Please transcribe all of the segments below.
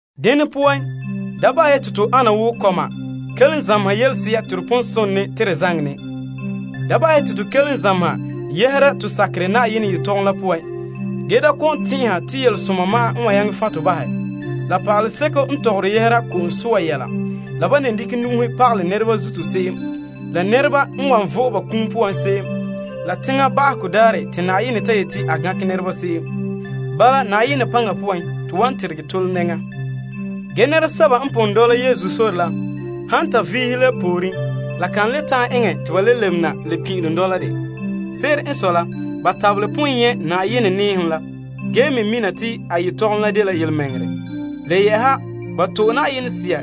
Dene poan, da bahɛ ya te to ana wo kɔma kelom zameha yelese'a te to pon sone te to zaŋɛ ne. To pon zamehe ya yɛhera to sakerɛ Na'ayenɛ yelehom la poan ge da kɔ'ɔn tɛn'ɛha te yelesoma n wan ta'an fan' tɔ bahɛ, la pa'aleseko n tɔgɔre yɛhera ko'om soa yɛla la, ban ne dekɛ nu'uhe pagalɛ nɛreba zuto se'em, la nɛreba n wan vo'e ba kum poan se'em, la teŋa ba'ahegɔ daarɛ la Yenɛ n ta yeti a gankɛ nɛreba se'em. Ge nananawa, Na'ayenɛ paŋa poan, to wan teregɛ tole nɛŋa. Ge nɛresɛba n pon dɔla Yesu sore kan ta'an lebe na pin'ilom dɔla dɛ, ban tabelɛ pon nyɛ' Na'ayenɛ nɛɛhom la mɛ ge mɛ to'e faanrɛ, la ban to'e Na'ayenɛ Sea,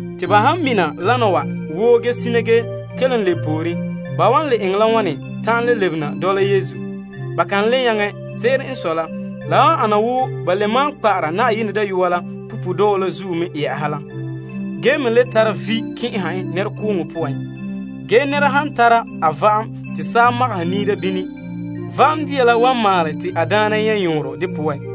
Te ba han mina dena wa woo ge sina ge kelom lebe pooren, ba wan le eŋɛ la wane ta'an le lebe dɔla Yesu? Ba kan le nyaŋɛ. Se'ere n sɔe la, la wan ana wo ba le maan kpa'ara Na'ayenɛ Dayɔa la punpuuredɔɔ zuo la me yɛ'ɛha la ge me le tara vi' kɛn'ɛhe en nɛrekooŋɔ poan. Nɛra se'em n zo'ore Yesu sore dɔlɔga la poan, Na'ayenɛ wan kan' kan'somɔ bo en wo saa magaha niira va'am ge va'am dia la wan maalɛ te a daana nyɛ' yɔɔrɔ de poan.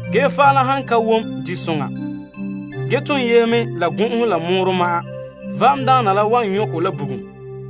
Ge va'am la han ka wom disoŋa ge ton yehe mɛ la gɔn'ɔhe la mɔɔrɔ ma'an, va'amdaana la wan nyɔ' kɔ la bugum.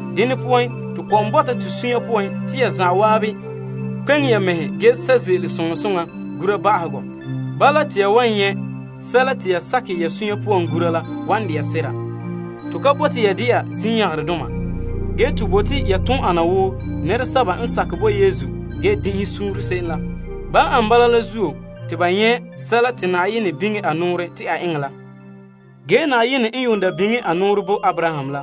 Dene poan to kɔ'ɔn bɔta to suunre poan te ya zan'an kpeŋe ya mɛhe ge sɛ' ze'ele soŋa soŋa gura ba'ahegɔ. Bala, te ya wan nyɛ' sɛla te ya sakɛ ya sunya poan gura la wan de'a sera. To ka bote ya dɛna zinyangarɛdoma. Ge, to bote ya toon ana wo nɛresɛba n sakɛ bo Yesu ge din'inhe suunre se'em la. Yamam ane bala la zuo te ya wan nyɛ' sɛla te Na'ayenɛ biŋe a nɔɔrɛ te a eŋɛ la. Na'ayenɛ n yuun da biŋe a nɔɔrɛ bo Abraham la,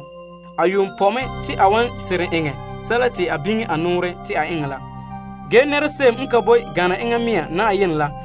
a yuun pɔ' mɛ te a wan seren eŋɛ sɛla te a biŋe a nɔɔrɛ te a eŋɛ la. A yuun pɔ' a mɛŋa yu'urɛ poan, se'em n ka boe gana enŋa mɛŋa la zuo.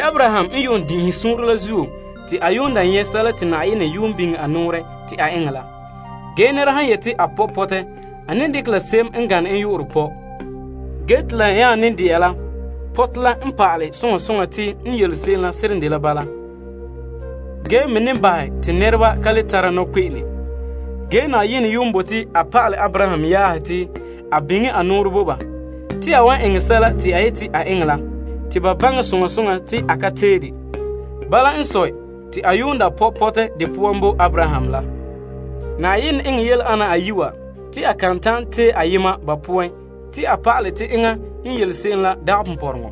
Abraham n yuun din'inhe suunre la zuo te a yuun da nyɛ' sɛla te Na'ayenɛ yuun da biŋe a nɔɔrɛ te a eŋɛ la. Nɛra han yeti a pɔ' pɔtɛ, a ne dekɛ la se'em n gane en yu'urɛ pɔ'. Ge te la nya dela pɔtɛ la n pa'alɛ soŋa soŋa te n yele se'em la seren dela bala, ge me ne bahɛ te nɛreba ka le tare nɔkpe'ene. Na'ayenɛ yuun bote a pa'alɛ Abraham yaahe te a biŋe a nɔɔrɛ bo ba te a wan eŋɛ sɛla te a yeti a eŋɛ la te ba baŋɛ soŋa soŋa te a kan tee de. Bala n sɔe, te a yuun da pɔ' pɔtɛ de poan bo Abraham la. Na'ayenɛ eŋɛ yele ana ayi' wa te a kan ta'an tee ayema ba poan te a pa'alɛ te enŋa n yele se'em la dagɛ ponpɔrɔŋɔ.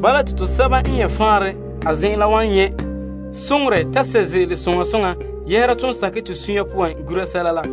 Bala, te tosɛba n nyɛ' faanrɛ a zen'en la wan nyɛ' soŋorɛ ta sɛ' ze'ele soŋa soŋa yɛhera ton sakɛ to sunya poan gura sɛla la.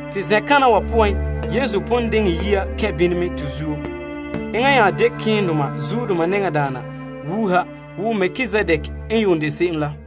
Te zen'kana wa poan, Yesu pon diŋɛ to yia kɛn' bini mɛ tomam zuo. Enŋa nya dela malemadaana ka tara ba'ahegɔ wo Melkizedek la.